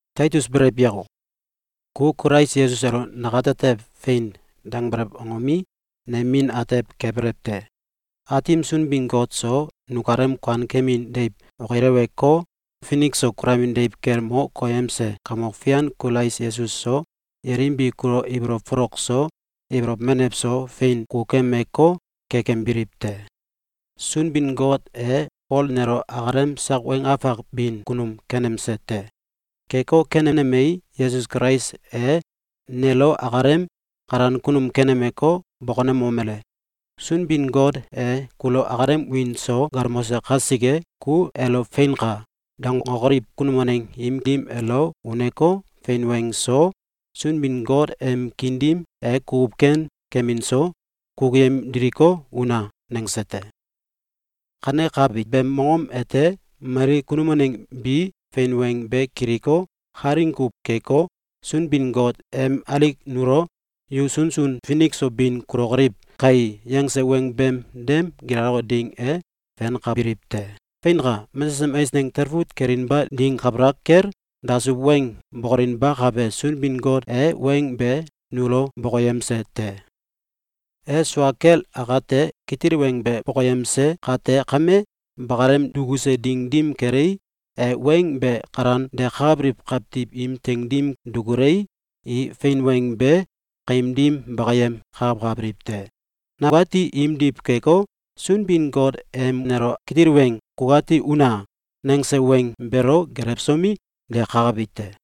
Taitus, belew yako! Ku Kulais Yesus elo nukatetew “Fein!”, dangbelew angomi, nem min atew kebelew te. Aatim Sunbin-Got so, nukalem kuankemin deiw okileweko, finik so kulamin deiw kel mo koyemse Kamok Fian Kulais Yesus so, yelim bi kulo ibolow folok so, ibolow menew so fein kukukemeko, kekembiliw te! Sunbin-Got e Fol nelo akalem sak weng afak bin kunum kenemse te. Keko kanenemei, Yesus Kulais e nelo akalem kalan kunum kenemeko, bokonemomele: “Sunbin-Got e kulo akalem wiin so galmose kasike, ku elo ‘Feinka!’, dangokoliw kunum waneng im dim elo uneko, fein weng so, Sunbin-Got em kiin dim e kukuw ken kemin so, kukuyem diliko, una!”, nangse te. Kanekabi beem mongom ete mali kunum waneng bi fein weng be kiliko, kalaing kuw keko, Sunbin-Got em alik nulo “Yu sunsun finik so bin kulokoliw kai!”, yangse weng beem dem gilaloke ding e fenkabiliw te. Feinka! Mesesem eisneng talfut kelinba ding kabalak kel dasuw weng bokolinbakabe Sunbin-Got e weng be nulo bokoyemse te. E sua kel akate kitil weng be bokoyemse kate kame, bakalem dukuse ding dim kelei, e weng be kalan dekakabiliw kawtiw im teing dim dukulei, i fein weng be kaim dim bakayem kakakabiliw te. Nakati imdiw keko, Sunbin-Got em nelo kitil weng “Kukati una!”, nangse weng beelo gelewsomi, dekakabi te.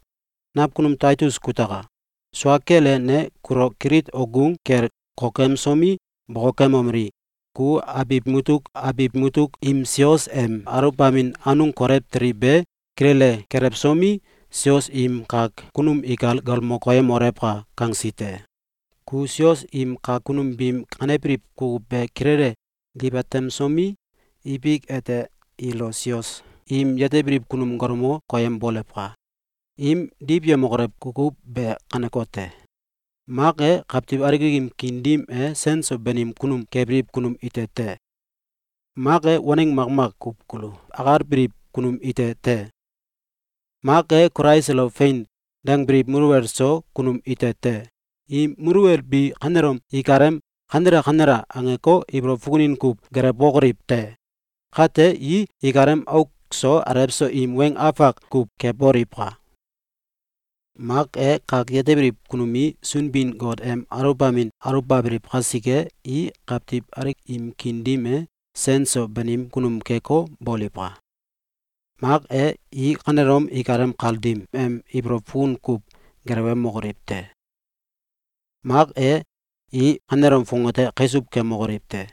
Nakunum Taitus kutaka! Sua kel e, ne kulo Kilit okgung kel kokemsomi, bokokemomeli: “Ku abiw mutuk abiw mutuk im sios em aluwbamin anung kolew teli be kilele kelewsomi, sios im kak kunum ikal galmo koyemolewka!”, kangsi te. Ku sios im kak kunum biim kanebiliw kukuw be kilele diwatemsomi, ibik ete ilo sios im yetebiliw kunum galmo koyembolewka! Im diwyemokolew kukuw be kanekote: Mak e, kawtiw alik im kiin dim e sen so banim kunum kebiliw kunum ite te. Mak e, waneng makmak kuw kulu akalbiliw kunum ite te. Mak e, Kulais elo “Fein!”, dangbiliw muluwel so kunum ite te. Im muluwel bi kanelom ikalem “Kanela! Kanela!”, angeko, ibolow fukunin kuw gelewbokoliw te! Kate, i ikalem auk so alew so im weng afak kuw keboliwka! Mak e, kak yetebiliw kunum i Sunbin-Got em aluwbamin aluwkabiliw kasike, i kawtiw alik im kiin dim e sen so banim kunum keko, boliwka! Mak e, i kanelom ikalem kal dim em ibolow fukunin kuw gelewemokoliw te! Mak e, i kanelom fongate kaisuw kemokoliw te!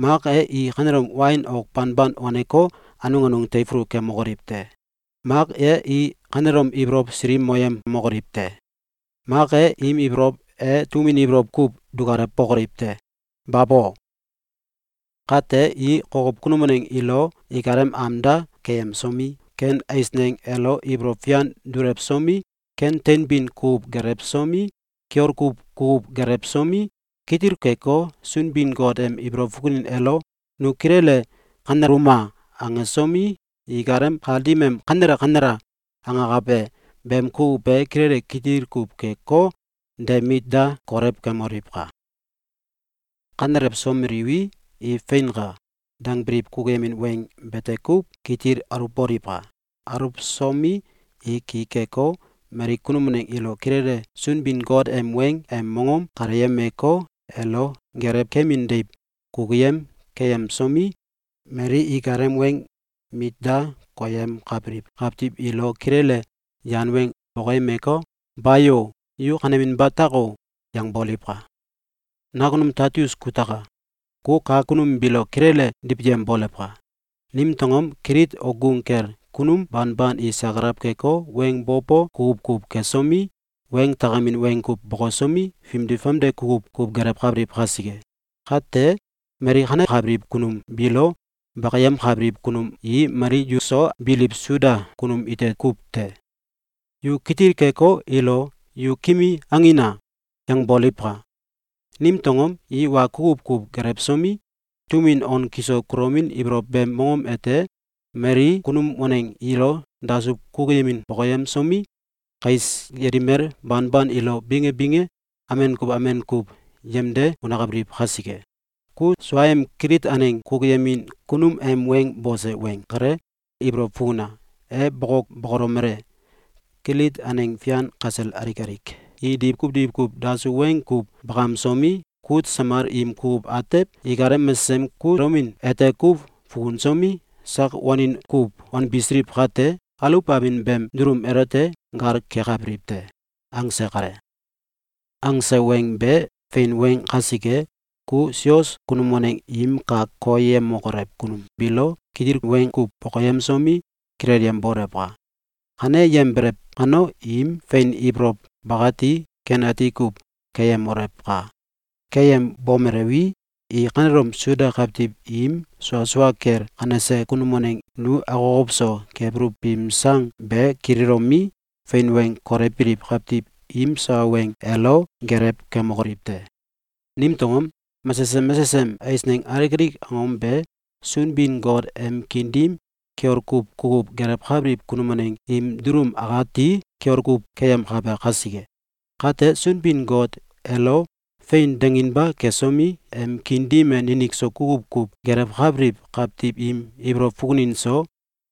Mak e, i kanelom wain ok banban waneko, anung anung teifulu kemokoliw te! Mak e i kanelom ibolow silikmoyemokoliw te! Mak e, im ibolow e tum win ibolow kuw dukalewokoliw te! Babo! Kate, i kokow kunum waneng ilo ikalem am da keyemsomi, ken eisneng elo ibolow fian dulewsomi, ken teinbin kukuw gelewsomi, kiol kuw kukuw gelewsomi, kitil keko, Sunbin-Got em ibolow fukunin elo “Nu kilele kaneluma!”, angsomi, ikalem kal dim em “Kanela! Kanela!”, angakabe beem kukuw be kilele kitil kuw keko, de mit da kolewkemoliwka! Kanelewsomeliwi, i “Feinka!”, dangbiliw kukuyemin weng bete kuw kitil aluwboliwka! Aluwsomi, i ki keko, mali kunum waneng ilo kilele Sunbin-Got em weng em mongom kaleyemeko, elo gelew kemin deiw kukuyem keyemsomi, mali ikalem weng mit da koyemkabiliw kawtiw ilo kilele yan weng bokoyemeko, “Bayo! Yu kaneninba tako!”, yangboliwka! Nakunum Taitus kutaka! Ku kak kunum biilo kilele diwyembolewka! Nimtew angom? Kilit okgung kel kunum banban i sakalaw keko, weng bo bo kukuw kuw kesomi, weng takemin weng kuw bokosomi, fimdi famde kukuw kuw gelewkabiliw kasike. Kate, mali kanekabiliw kunum biilo bakiyemkabiliw kunum i mali yuso biliw Suda kunum ite kuw te. Yu kitil keko, ilo “Yu ‘Kimi!’, angina!”, yangbolewka! Nimtew angom? I wa kukuw kuw gelewsomi, tum win on kisol kulomin ibolow beem mongom ete mali kunum waneng ilo dasuw kukuyemin bokoyemsomi, kais yelimel banban ilo binge binge amen kuw amen kuw yemde unakabiliw kasike. Ku suaem Kilit aneng kukuyemin kunum em weng bose weng kale ibolow fukuna! E boko, bokolomele: “Kilit aneng fian kasel alik alik i diwkuw diwkuw dasuw weng kuw bakamsomi, kut samal im kukuw atew ikalem mesesem kulomin ete kuw fukusomi, sak wanin kuw wanbisiliw kate, aluwbamin beem dulum elote gal kekabiliw te!”, angse kale. Angse weng be fein weng kasike, ku sios kunum waneng im kak koyemokolew kunum biilo kitil weng kuw bokoyemsomi, kilelyembolewka! Kaneyembelew kano, im fein ibolow bakati ken ati kuw keyemolewka! Keyembomelewi, i kanelom Suda kawtiw im sua sua kel kanese kunum waneng nu akokow so kebuluw biim sang be kililomi, fein weng kolewbiliw kawtiw im sawa weng elo gelew kemokoliw te! Nimtew angom? Mesesem mesesem eisneng alik alik angom be Sunbin-Got em kiin dim kiol kuw kukuw gelewkabiliw kunum waneng im dulum akati kiol kuw keyemkabe kasike. Kate, Sunbin-Got elo “Fein!”, danginba kesomi, em kiin dim e ninik so kukuw kuw gelewkabiliw kawtiw im ibolow fukunin so,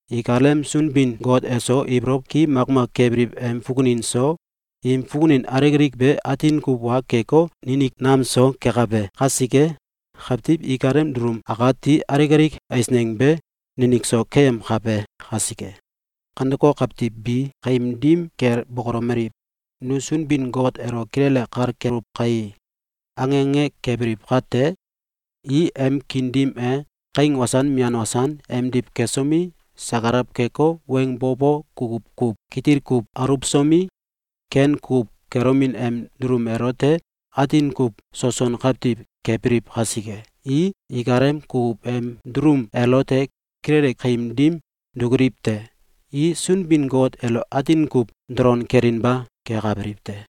ikalem Sunbin-Got eso ibolow ki makmak kebiliw em fukunin so, im fukunin alik alik be atin kuw wa keko, ninik nam so kekabe kasike, kawtiw ikalem dulum akati alik alik eisneng be ninik so keyemkabe kasike. Kaneko kawtiw bi kaim dim kel bokolomeliw: “Nu Sunbin-Got elo kilele kal keluw kai!”, ange ange kebiliw kate, i em kiin dim e kaing wasan mian wasan emdiw kesomi, sakalaw keko, weng bo bo kukuw kuw kitil kuw aluwsomi, ken kukuw kelomin em dulum elote atin kuw soson kawtiw kebiliw kasike, i ikalem kukuw em dulum elote kilele kaim dim dukuliwete: I Sunbin-Got elo atin kuw dolon kelinba kekabiliw te.